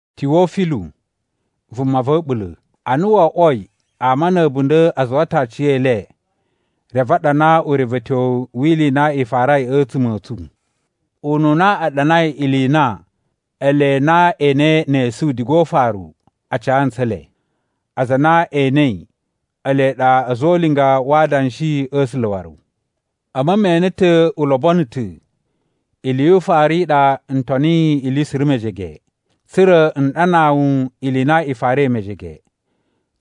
Tiwofilu, vuma va̱ a̱ɓula̱: Ana wo oꞌwoi, ama na̱ a̱bunda̱ a zuwa ta̱ aciyele reve a ɗana urevetyowu wi ili i na i farai a̱tsuma̱ a̱ tsu. Ununa a ɗanai ili i na ele na e enei ne esu diga o ufaru a ca ntsu ele, aza a na e enei ele ɗa a̱za̱ o ulinga wa adanshi a̱ A̱sula̱ waru. A̱mu me ene ta̱ u lobono ta̱, ili yu ufaru i ɗa n toniyi ili suru mejege, tsa̱ra̱ n ɗanaa wu ili i na i farai mejege,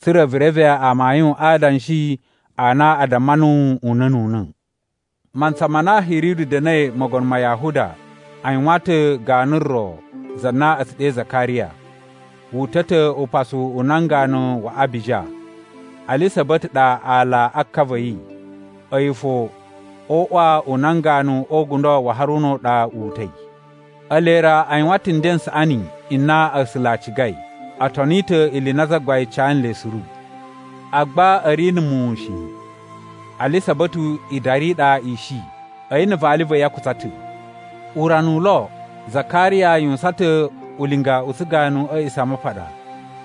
tsa̱ra̱ vu reve amayun a adanshi a na a damma nuwu una̱ nu una̱. Mantsa ma na Hiridu da̱na̱i Mogono ma Yahuda, a yuwan ta̱ ganu ro, za na a̱ tsu ɗe Zakariya. Wu uta̱ ta̱ upasu u nan ganu wa Abija. Alisa̱ba̱tu ɗa aala a ka va̱ yi. A̱yi fo o uꞌwa u nan ganu o ugundo wa Haruna u ɗa wu uta̱i. Ele ra a yuwan ta̱ nden n saꞌani n na A̱sula̱ a cigai. O toni ta̱ ili i na Zagbain ca nle suru. Agba a̱ ri na̱ muwun shi. Alisa̱ba̱tu idari i ɗa i shi. A̱yi na̱ vali va̱ yi a kutsa ta̱. Urana u lo, Zakariya yuwusan ta̱ ulinga u tsuganu a̱ A̱a̱ꞌisamapaɗa,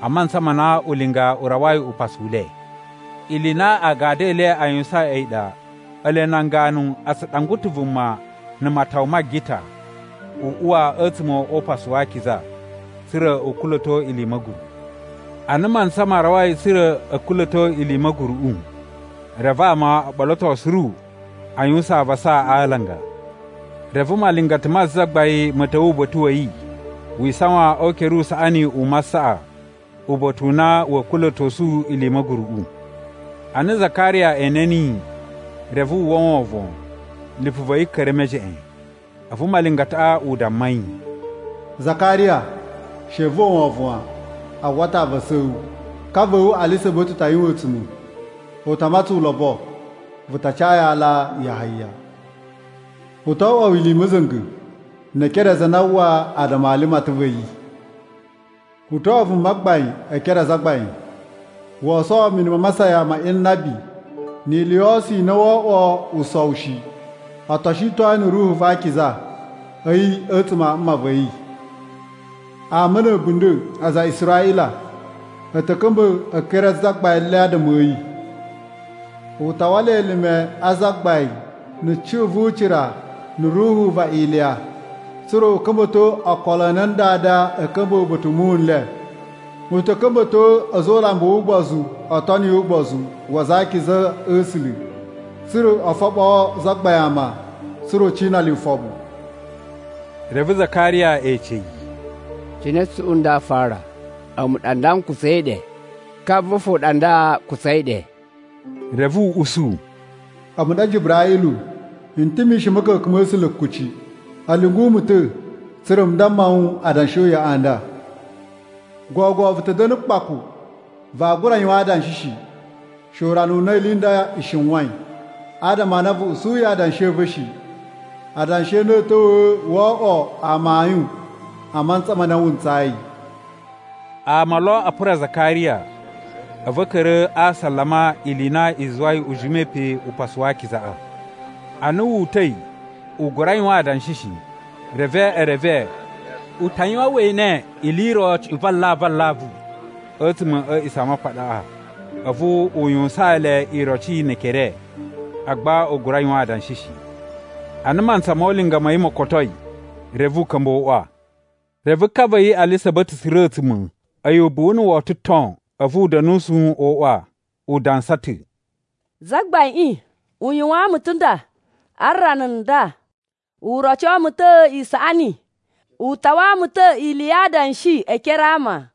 a mantsa ma na ulinga u rawai upasu u le. Ili i na agadu e le a yuwusain a̱yi ɗa, ele nan ganu a tsu ɗangwa ta̱ vuma na̱ matawa ma agita, u uwa a̱tsuma̱ o Upasu wa Akiza, tsa̱ra̱ u kula̱to ili i ma̱guru. Ana mantsa ma rawai tsa̱ra̱ a̱ kula̱to ili i ma̱guruꞌu, reve ama o ɓoloto suru a yuwusan avasa a alanga. Reve malingata ma Zagbain ma̱ ta̱wa̱ uba̱ta̱ wa̱ yi, wi isawan o ukere u usaꞌani u masaꞌa, uba̱ta̱ u na wa̱a̱ kula̱tosu ili i ma̱guruꞌu. Ana Zakariya ene niyi, reve wu uwwa wovon, lipu va̱ yi ka̱ra̱ e mejeꞌen. A̱vu malingataꞌa u damma yi, “Zakariya, she vu uwwa wovon wan, a uwwa ta̱ avasa a̱ wu. Ka va̱ wu, Alisa̱ba̱tu ta yuwan a̱a̱tsuma̱, u ta matsaan wu ulobo. Vu ta ca yi aala Yahaya. U to oꞌwo wu ili i ma̱za̱nga̱, ne e ekere a aza a na aa uwwa adama a limatan va̱ yi. U to oꞌwo vumagbain e ekere a Zagbain. Woo sowo mini ma masayan ma inabi, ni ili yo oso i na woo oꞌwo usowu shi. O to shiton yi na̱ Ruhu va Akiza a̱yi a̱ a̱a̱tsuma̱ a mma va̱ yi. Ama na̱ a̱bunda̱ aza a Israꞌila a̱ ta̱ ka̱mba̱ e ekere a Zagbain le adama a̱ yi. U ta wala elime a Zagbain na̱ cuꞌun vu ucira na̱ ruhu va Iliya, tsa̱ra̱ a̱ ka̱mba̱to okolo a nan dada a̱ ka̱mba̱ uba̱ta̱ u muwun n le. U ta̱ ka̱mba̱to a̱za̱ o ulambu wu ugbozu o toni ugbozu wa aza a akiza a̱ A̱sula̱, tsa̱ra̱ u foɓoo Zagbain ama, tsa̱ra̱ u cina le ufoɓu.” Reve Zakariya ece yi, “Cine cuꞌun nda aa fara? A̱mu ɗa nda n kutsai ɗe, ka va̱ fo ɗa nda u kutsai ɗe.” Reve u usu, “A̱mu ɗa Jiburaꞌilu, n ta̱ mishin a̱ ma̱ka̱ka̱n ma̱ A̱sula̱ kuci. A̱ lyungu mu ta̱, tsa̱ra̱ n damma wu adanshi o uyoꞌo a nda. Gogo vu ta̱ da̱na̱ kpaku, vaa gura yuwan adanshi shi, she urana u na ili i nda i shiwain. Adama a na vu usuyi adanshi a̱ va̱ shi. Adanshi a na a̱a̱ ta̱wa̱ woo oꞌwo amayun a mantsa ma na wu ntsayi.” Ama lo a pura Zakariya, a̱vu a̱ ka̱ra̱ a asalama ili i na i zuwai u jimai pe Upasu wa Akizaꞌa. Ana wu uta̱i, u gura yuwan adanshi shi. Reve e reve u ta yuwan we ene ili i ro cuꞌun va alavu alavu a̱tsuma̱ a̱ A̱a̱ꞌisamapaɗaꞌa. A̱vu u yuwusaan le iroci ne ekere, agba u gura yuwan adanshi shi. Ana mantsa mo ulinga ma̱ yi mo kotoi, reve u ka̱mba̱ o uꞌwa. Reve ka va̱ yi Alisa̱ba̱tu tsura̱ a̱a̱tsuma̱. A̱yi ubuwu na̱ woto ton, a̱vu u da̱nusu o uꞌwa. U dansa ta̱, “Zagbaiꞌin u yuwaan mu ta̱ nda, a rana nda u roco mu ta̱ isaꞌani, u tawa mu ta̱ ili ya adanshi e ekere a ama.”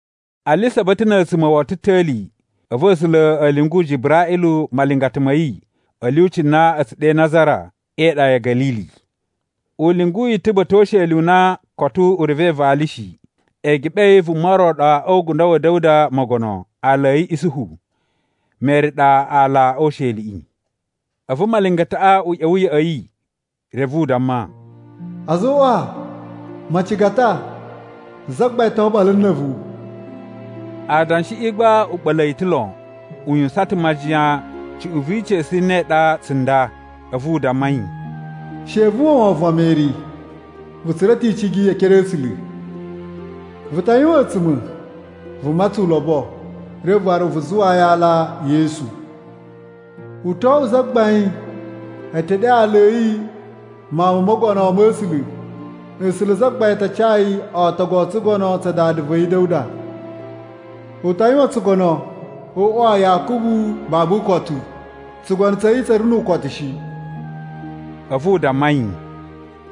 Alisa̱ba̱tu na̱ a̱a̱tsuma̱ woto ta̱li, a̱vu A̱sula̱ a̱ lyungu Jiburaꞌilu malingata ma̱ yi a̱ lyuci na a̱ tsu ɗe Nazara e iɗa ya̱ Ga̱lili. U lyungu yi ta̱ uba̱ta̱ o usheli u na koto u revei vali shi, eegeɓe a̱ yi vuma ro ɗa o ugundo wa̱ Da̱wuda Mogono, aala a̱ yi Isuhu. Meri ɗa aala o usheliꞌi. A̱vu malingataꞌa u ꞌya̱wa̱ ya̱ꞌa̱ yi, reve u damma, “A̱zoꞌwa, macigata, Zagbain to oɓolo na̱ a̱vu!” Adanshiꞌi gba u ɓa̱la̱ yi ta̱ lon, u yuwusan ta̱ majiyan cuꞌun vi ica̱su i ne i ɗa tsunda. A̱vu u damma yi, “She vu uwwa wovon wan, Meri. Vu tsura̱ ta̱ icigi e ekere a̱ A̱sula̱. Vu ta yuwan a̱a̱tsuma̱, vu matsan ulobo, reve waru vu zuwaa yi aala Yesu. U to oꞌwo zagbain. E te ɗe aala a̱ yi Mawun mo Mogono ma̱ A̱sula̱. A̱sula̱ Zagbain a ta ca yi ootogu o tsugono tsa dada va̱ yi Da̱wuda. U ta yuwan tsugono o uꞌwa wa Yakubu babu ukotu. Tsugono tsa̱ yi tsa̱ ri nu ukosu shi.” A̱vu u damma yi,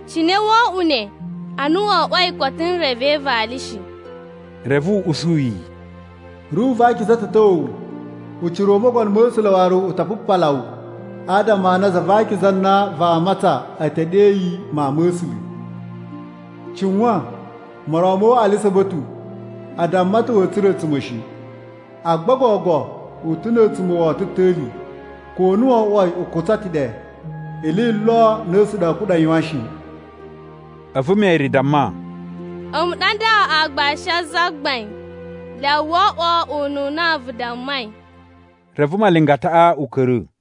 “Cine woo oꞌwo ne, ana wo oꞌwoi koto n reve vali shi?” Reve u usu yi, “Ruhu va Akiza ta̱ ta̱wa̱ wu, ucira u Mogono ma̱ A̱sula̱ waru u ta pupala wu, adama a na za va akiza a na vaa matsan a̱ ta̱ ɗe yi Mawun ma̱ A̱sula̱. Cuwan moron ma̱ wu Alisa̱ba̱tu. A damma ta̱ wa̱a̱ tsura̱ a̱a̱tsuma̱ shi, agba gogo u ta̱ na̱ a̱a̱tsuma̱ woto ta̱li, ko na wo oꞌwoi u kutsai ɗe. Ili i lo a na A̱sula̱ a̱a̱ kuɗa̱ yuwan shi.” A̱vu Meri damma, “A̱mu ɗa nda aagbashi a Zagbain. Lyawa wo oꞌwo ununa vu dammai.” Reve malingataꞌa u ka̱ra̱.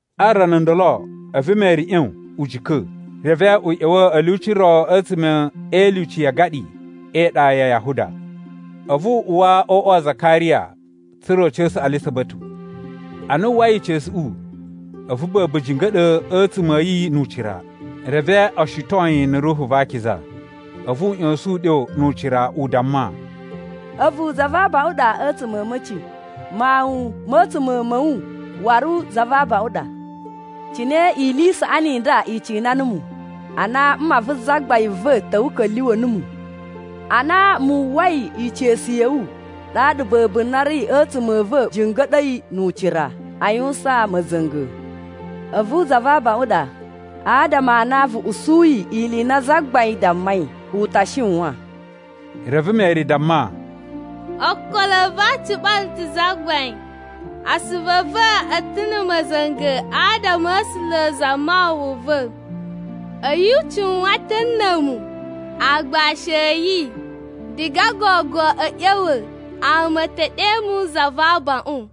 A rana ndolo, a̱vu Meri ꞌyon u jika̱, reve u ꞌya̱wa̱ a̱ lyuci ro a̱tsuma̱ e ilyuci ya agaɗi e iɗa ya Yahuda. A̱vu u uwa o uꞌwa wa Zakariya, tsa̱ra̱ u ca̱sa̱ Alisa̱ba̱tu. Ana wu uwwai ica̱suꞌu, a̱vu ba̱ba̱ jinga̱ɗa̱ a̱ a̱a̱tsuma̱ a̱ yi nu ucira. Reve o shiton yi na̱ Ruhu va Akiza. A̱vu u ꞌya̱sa̱n uɗyo nu ucira, u damma, “A̱vu za va abaꞌun a ɗa a̱tsuma̱ a̱ a̱ma̱ci. Mawun ma̱ a̱a̱tsuma̱ a̱ wu waru za va abaꞌun a ɗa! Cine ili i saꞌani i nda i cina numu, a na mma vu Zagbain va̱ ta̱wa̱i u ka̱lyuwa̱ mu? Ana mu uwwai ica̱su ya̱ wu, ɗaɗa ba̱ba̱ na ri a̱ a̱a̱tsuma̱ a̱ va̱ jinga̱ɗa̱i nu ucira a yuwusan ma̱za̱nga̱. A̱vu za va abaꞌun ɗa adama a na vu usuyi ili i na Zagbain dammai u ta shiwan.” Reve Meri damma, “Ookolo a̱ va̱ a ciɓala ta̱ Zagbain. Asuvu a̱ va̱ a̱ ta̱ na̱ ma̱za̱nga̱ adama a̱ A̱sula̱ Zamawawa va̱. A̱yi u cuwan ta̱ na̱ a̱mu, aagbashi a̱ yi. Diga gogo a̱ ꞌya̱wa̱, ama a̱ ta̱ ɗe mu za va abaꞌun.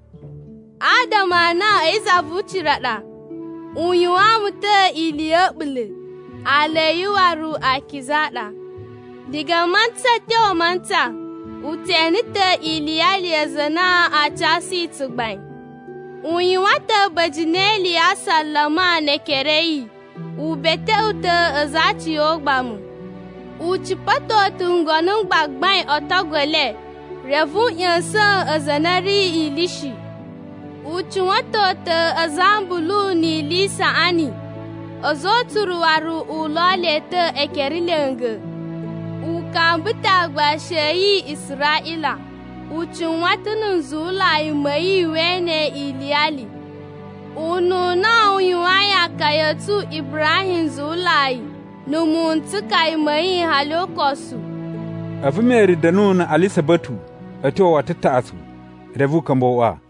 Adama a na a̱yi Zavucira ɗa, u yuwaan mu ta̱ ili ya̱ a̱ɓula̱. Aala a̱ yi waru akiza a ɗa. Diga mantsa a̱ tyo mantsa, u tse ene ta̱ iliyali ya aza a na a casu yi tsugbain. U yuwan ta̱ a̱ba̱jini e ili ya asalama ne ekere a̱ yi, u beteꞌwe ta̱ aza a aciyogbamu. U cipa̱to ta̱ ngono m gbagbain o otogu e le, reve u ꞌya̱sa̱n aza a na a̱ ri ili shi. U cuwa̱ton ta̱ aza a ambulu ni ili i saꞌani, a̱za̱ o utsuru waru u lo le ta̱ ekere lya̱nga̱. U kamba ta̱ aagbashi a̱ yi Israꞌila, u cuwan ta̱ na̱ nzuwulai ma̱ yi we ene yi iliyali. Ununa u yuwayin akaya a̱ tsu Ibrahim nzuwulai, na̱ muwun n tsukaya ma̱ yi hali ukosu.” A̱vu Meri da̱nu na̱ Alisa̱ba̱tu a̱ tyo woto taꞌatsu, reve u ka̱mba̱ o uꞌwa.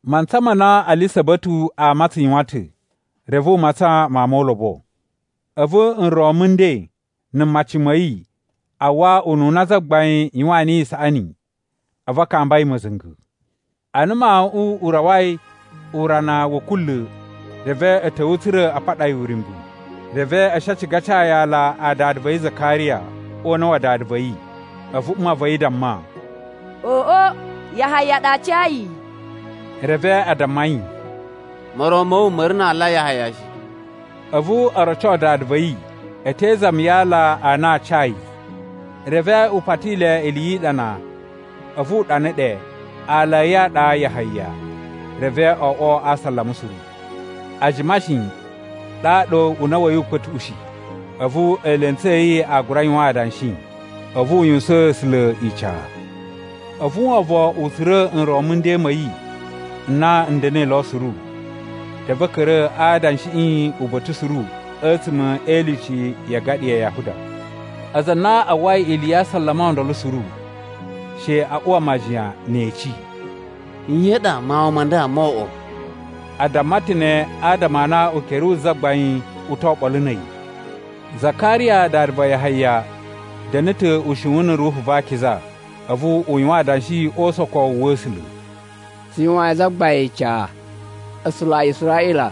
Mantsa ma na Alisa̱ba̱tu aa matsan yuwan ta̱, reve u matsan mawun mo ulobo. A̱vu nron mu nden na̱ mmaci ma̱ yi, a uwwa ununa Zagbain yuwaan niyi isaꞌani, a̱vu a kamba yi ma̱za̱nga̱. Ana mawuꞌun u rawai urana wa̱ kunla̱, reve a̱ ta̱wa̱ tsa̱ra̱ a paɗa yi uryumbu, reve a̱ shi a ciga a ca yi aala a dada va̱ yi Zakariya o una̱ wa dada va̱ yi. A̱vu mma va̱ yi damma, “Oꞌo, Yahaya ɗa aa ca yi.” Reve a damma yi, “Moron ma̱ wu ma̱ ri na aala Yahaya shi.” A̱vu o roco dada va̱ yi, a̱ te izami ya aala a na aa ca yi. Reve u pati le ili yi iɗana, a̱vu u ɗana ɗe, “Aala a̱ yi a ɗa Yahaya.” Reve o oꞌwo a asalama suru. A jima shi, ɗaɗa una̱ wa̱ yi u kpa̱tuꞌushi, a̱vu eelentsu a̱ yi a gura yuwan adanshi. A̱vu u yuwusaan A̱sula̱ ica. A̱vu wovon u tsura̱ nron mu nden ma̱ yi n na n da̱na̱i lo suru. Reve a̱ ka̱ra̱ a adanshiꞌi uba̱ta̱ suru a̱tsuma̱ e ilyuci ya agaɗi ya Yahuda. Aza a na a uwwai ili ya asalama o ndolo suru, she a uwa majiyan ne e eci, “Nye i ɗa mawun ma nda moo oꞌwo?” A damma ta̱ ne adama a na ukere wu Zagbain u to oɓolo na̱ a̱yi. Zakariya dada va Yahaya da̱na̱ ta̱ ushiwun na̱ Ruhu va Akiza, a̱vu u yuwan adanshi o usokowu wa̱ A̱sula̱: “Tsu yuwayin Zagbain ica, A̱sula̱ a Israꞌila!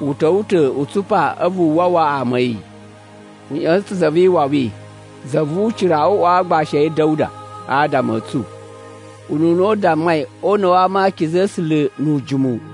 U ta̱wa̱ ta̱ u tsupa a̱vu u wawa ama a̱ yi. U ꞌya̱sa̱n ta̱ Za vi Iwawi za vu ucira o uꞌwa wa aagbashi a̱ yi Da̱wuda adama a̱ tsu. (Ununa u dammai o una̱ wa ama a akiza a̱ A̱sula̱ nu ujimu.)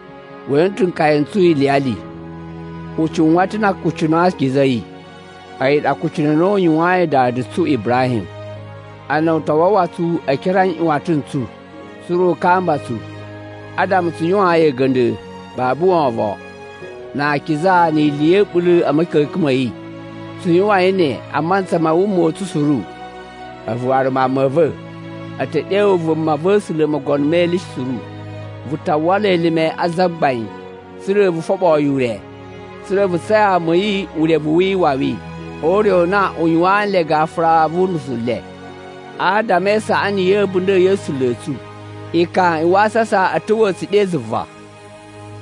We ene ta̱ nkaya n tsu iliyali, u cuwan ta̱ na akucunu a akiza a̱ yi. A̱yi ɗa akucunu a na u yuwayin dada tsu Ibrahim. Ana u ta wawa tsu e ekere a nꞌyuwatan n tsu, tsa̱ra̱ u kamba tsu. Adama tsu yuwaan yi a̱ga̱nda̱ babu wovon, na akiza ni ili ya̱ a̱ɓula̱ a̱ ma̱ka̱ka̱n ma̱ yi. Tsu yuwain ne a mantsa ma wuma ma̱ tsu suru. A̱vu waru, mawun ma̱ va̱, a̱ ta̱ ɗe wu vumava̱sula̱ Mogono me Ili Suru. Vu ta̱ wala elime a Zagbain, tsa̱ra̱ vu foɓoo yi ure, tsa̱ra̱ vu ca ama a̱ yi urevu wi iwawi o ure u na a yuwaan le gafura vu unusu u le. Adama e isaꞌani ya̱ a̱bunda̱ ya̱ A̱sula̱ a̱ tsu, ekan a wasasa a̱a̱ ta̱wa̱ tsu ɗe zuva.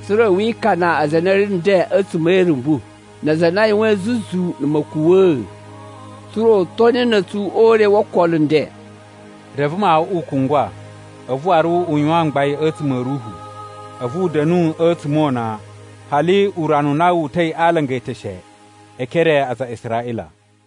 Tsa̱ra̱ wi ikana aza a na a̱ ri nden a̱tsuma̱ e irumbu, na aza a na a yuwain zuzu na̱ ma̱kuwa̱a̱, tsa̱ra̱ u toni na̱ a̱tsu ure wo okolo a̱ nden.” Reve mawuꞌun u kungwa, a̱vu waru u yuwan mgbain a̱tsuma̱ a̱ ruhu. A̱vu u da̱nu a̱tsuma̱ o una, hali urana u na wu uta̱i a alanga e eteshe e ekere a aza a Israꞌila.